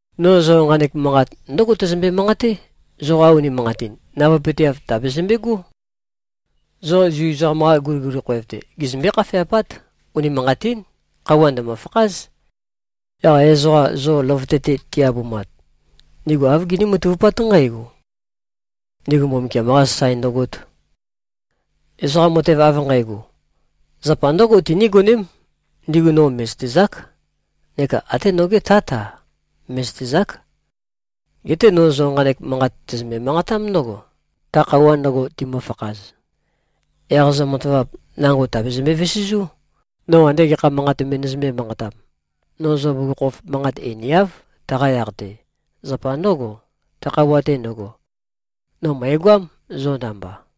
“No zo nqanek manqat ndǿgo tæzømbe-manqaté, zoqa unimanqatin navøepøteav tàbezømbegó. Zo Zu ezoqam-qa guliguli khoev-te, gizømbé-khafeapát. Unimanqatín. Khøuwa ndø̀mø-fakház. Yaq ezoqa zo løvøte-te ti-abumat, ndigu āv giní-matavupát nqǽgo: Ndigu Mbumbukiam-qā sasae ndøgōt. Ezoqa matev av nqægo, zapa ndǿgo tinígoném, ndigu no mè꞉zøtezák, neka até noge Tát-a, mè꞉zøtezák. Geté no zo nqanek manqat tæzømbe-manqatám ndǿgo, ta khøuwa ndøgo timøfakhaz, yaq zo matavap nango tàbezømbe-vesezú, no ande gekha manqat me nøzømbē-manqatam. No zo bugukhokhof manqat einiáv, taqa yaq-te. Zapa ndǿgo, ta khøuwa-te ndøgo, no mø̀egoám, zo namba.”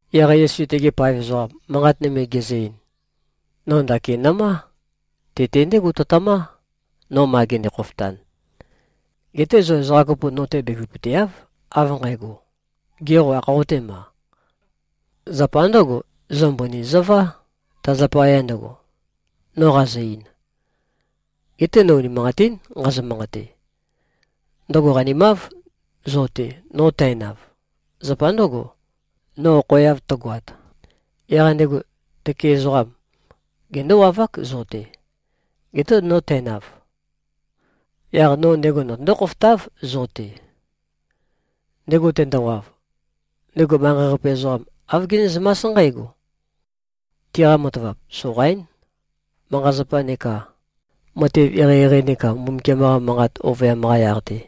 Yaq Yesu tegi paev ezoqam, manqat nøme gezø-ein, “No ndakin nø̀má. Te-te ndégo tøtømá, no ma gende-khofotan. Geté zo ezoqa kopo no-te bevøpøteáv av nqægo, ‘Gê, qo ākhoqotéma?’ Zapa ndǿgo, zo mbøni zøvá, ta zapaya ndøgo, no qazø-ein. Geté no unimanqatín nqazø-manqate. Ndøgo qanimáv zo-te, no tænav. Zapa ndǿgo, no okhoeav tøgoat, yaq ndego tøke ezoqam gendówavák zo-te. Geté no tænav, yaq no ndego notøndó-khofotáv zo-te. Ndego tendowav, ndego manqei-qape ezoqam āv genézømás nqǽgo: Tiqa matavap soqaín, manqa-zapa neka matev eqeieqei neka Mbumbukiam-qa manqa ovøyam-qa yaq-te.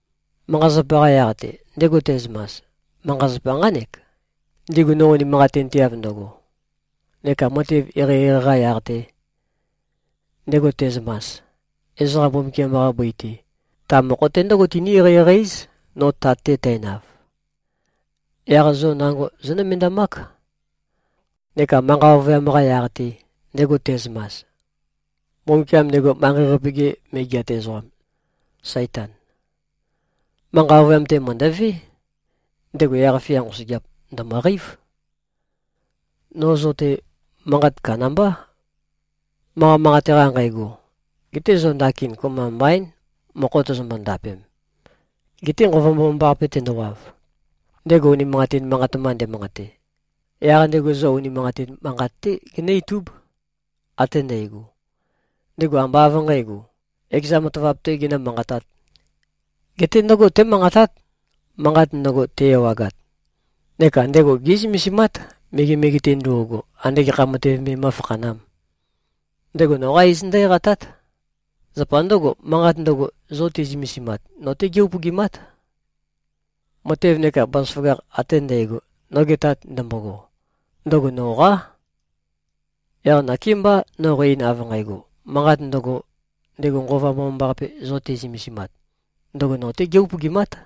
Manqa-zapa-qa yaq-te, ndego te꞉zømas: Manqa-zapa nqánek, ndigu no unimanqatinteav ndøgo. Neka matev eqeieqei-qa yaq-te, ndego te꞉zømas: Ezoqa Mbumbukiam-qa bøi-te, ta mokho-te ndǿgo tiní-eqeieqei-éz, no Tat-te tænav. Yaq zo nango zónømendamák. Neka manqa ovøyam-qa yaq-te, ndego te꞉zømas: Mbumbukiam ndego manqei-qape-ge megeat ezoqam, Saitan, manqa ovøyam-te mø̀ndøvé. Ndego yaq-fia nqosøgeap, ndø̀møqeív. No zo-te manqat kandambá, manqa manqate-qa nqægo. Geté zo ndakin kopømba mbaín, mokho tozombo-ndapem. Geté Nqova Mbomambaqape tendowav, ndego unimanqatin manqat mba ndemanqate, yaq ndego zo unimanqatin manqat-té genǿ-itúb, ate ndægo. Ndego ambá av nqǣgo, ekeza matavap-tē genǿ-manqatāt. Geté ndǿgo témanqatát, manqat ndøgo te-ewagat. Neka ndego gé꞉zømesimát, megemege-te ndo꞉go, ande gekha matev me mó꞉fakhanām. Ndego noqa iz ndǿ-eqatát. Zapa ndǿgo, manqat ndøgo, zo te꞉zømesimat, no-té gé-upøgimát. Matev neka bazaføgakh ate ndægo, noge Tat ndømbogo, ndøgo noqá. Yaq nakémbá no qæ-ein av nqægo, manqat ndøgo, ndego Nqova Mbomambaqape zo te꞉zømesimat, ndøgo no-tē gē-upøgimāt.”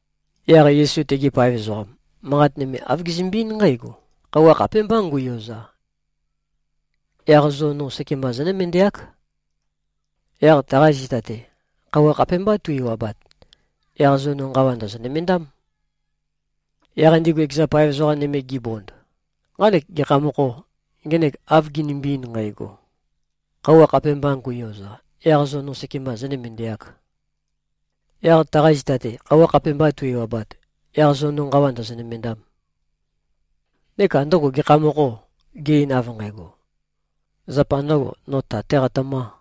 Yaq Yesu tegi paev ezoqam manqat nøme, āv gezømbe-eín nqǽgo, “Khøuwa khapémbá ngu꞉yoza, yaq zo no sekemba zónømendeák. Yaq taqa zita-te, khøuwa khapémbá tu-ewabat, yaq zo no nqawa ndòzo-nømendám.” Yaq ndigu ekeza paev ezoqa nøme gibond, “Nqanek gekha mokhô, ngenek av ginimbi-ein nqægo, ‘Khøuwa khapēmbā ngu꞉yoza, yaq zo no sekemba zōnømendeāk. Yaq taqa zita-te, khøuwa khapēmbā tu-ewabat, yaq zo no nqawa ndòzo-nømendām.’? Neka ndøgo gekha mokhô, ge-ein av nqægo, ‘Zapa ndø̄go, no Tat-tē qatømā.’?”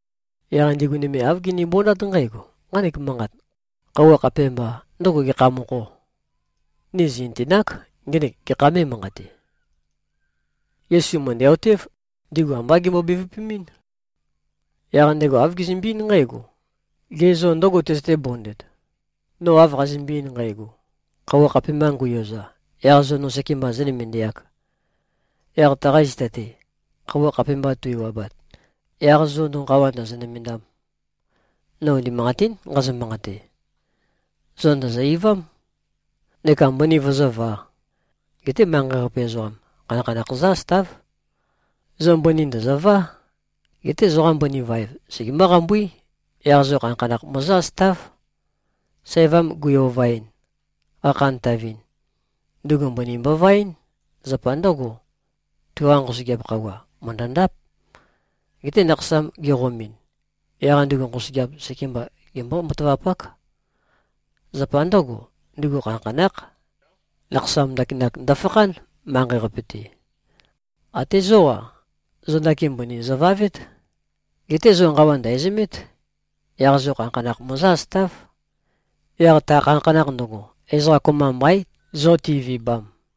Yaq ndigu nøme āv ginibondát nqǽgo, “Nqanek manqat, ‘Khøuwa khapēmbā,’ ndøgo gekha mokhô? Ni zì꞉nøtenák, ngenek gekha mē꞉manqate.” Yesu mø̀ndæ-otév, ndigu ambá gembo-bevøpemɨ́n. Yaq ndego āv gezømbe-eín nqǽgo, “Gê, zo ndǿgo tøzøté-bondet, no av qazømbe-ein nqægo, ‘Khøuwa khapēmbā ngu꞉yoza, yaq zo no sekemba zōnømendeāk. Yaq taqa zita-te, khøuwa khapēmbā tu-ewabat, yaq zo no nqawa ndòzo-nømendām.’? No unimanqatín nqazø-manqate: Zo ndòzo-eivám neka mbøni vøzǿvā. Geté manqei-qape ezoqam, khanakhanakh zǿ-asøtáv. Zo mbøni ndø̀zøvá. Geté zoqa mbøni vaev, segemǿ-qambuí. Yaq zo khanakhanakh møzǿ-asøtáv. Sævam gui-ovaɨn, qakhantavɨn, ndugu mbøni mbovaɨ́n. Zapa ndǿgo, tuqa nqosøgeap khøuwa mø̀ndøndáp. Geté nakhasam geqomɨn, yaq ndugu nqosøgeap sekemba gembó-matavapák. Zapa ndǿgo, ndugu khanakhanákh. Nakhasam ndakinak ndøfakhán, manqei-qape-te. Até zó-a, zo ndakin mbøni zøvavét. Geté zo nqawa ndæ̀zømét. Yaq zo khanakhanakh møzǿ-asøtáv. Yaq ta khanakhanakh ndøgo, ezoqa kopømba mbaín, zo ti꞉vibam.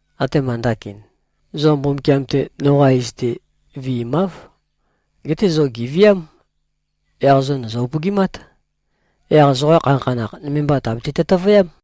Atema ndakin, zo Mbumbukiam-te noqa iz-te viimáv. Geté zo gèviám, yaq zo ndòzo-upøgimát. Yaq zoqa khanakhanakh, nøme mba tàbete-tøtøvøyám.”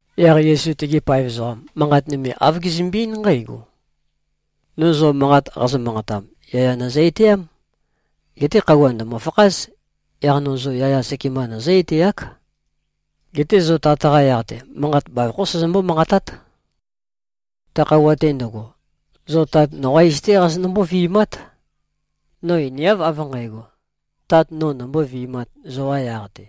Yaq Yesu tegi paev ezoqam, manqat nøme āv gezømbe-eín nqǽgo, “No zo manqat qazø-manqatam, yaya nøzø-etæám. Geté khøuwa ndø̀mø-fakház, yaq no zo yaya sekemba nøzǿ-etæák. Geté zo Tat-qa yaq-te, manqat bavokhó sæzømbó-manqatát. Ta khøuwa-te ndøgo, zo Tat noqá iz-té qazonømbó-vi꞉mát. No einiáv av nqǣgo, Tat nō nombóvi꞉māt zoqa yaq-te.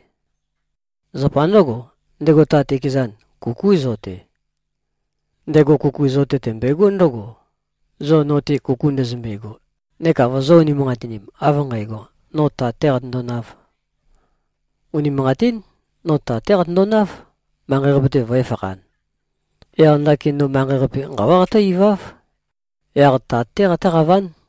Zapa ndǿgo, ndego Tat ekezan, kukú zo-te. Ndego kuku zo-te tømbøegó ndǿgo, zo no-te kuku ndøzømbego neka vozō-unimanqatinim, av nqægo, no Tat-tē qatøndonāv. Unimanqatín. No Tat-té qatøndonáv, manqei-qape-te vø̄efakhan. Yaq ndakin no manqei-qape nqawá qatǿ-iváv. Yaq Tat-té qatǿqaván.”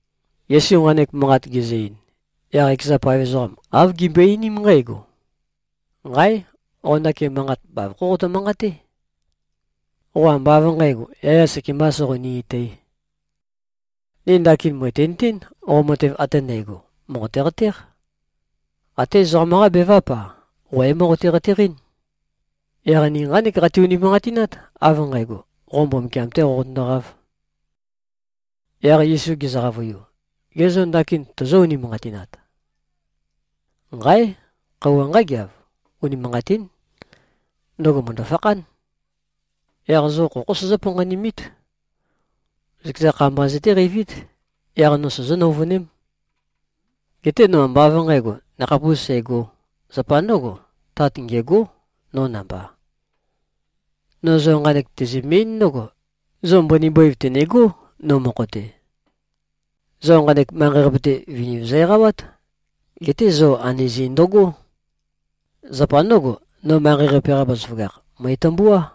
Yesu nqanek manqat gezø-ein, yaq ekeza paev ezoqam āv gimbøe-einím nqǽgo, “Nqáe! Qo ndakin manqat bavokhó qotø-manqaté. Qo ambá av nqǣgo, yaya sekembā soqoni-etǣ. Ni ndakin mø̀tinøtén, qo matev ate ndægo mòqote-qatéq. Até ezoqam-qá beváp-a, qo é-moqote-qateqɨ́n. Yaq ni nqánek qati-unimanqatinát, av nqægo, qo Mbumbukiam-té qoqotøndoqáv.” Yaq Yesu gezø-qavøiu, “Ge zô, ndakin tozó-unimanqatinat? Nqáe! Khøuwa nqágeav. Unimanqatín. Ndøgo mø̀ndø-fakhán. Yaq zo khokhó sozó-panqanimít. Zøkeza kha mba zøtéqeivít, yaq no sozó-nøuvøném. Geté no ambá av nqǣgo, nakhapūs sægō. Zapa ndǿgo, Tat ngêgó, no namba. No zo nqanek tæzømbe-eín ndǿgo: Zo mbøni bøiv tø̀negó, no mokho-te. Zo nqanek manqei-qape-te, viniv zo-eqawát. Geté zo anøzi ndøgó! Zapa ndǿgo, no manqei-qape-qa bazaføgakh, mø̀etømbuá.”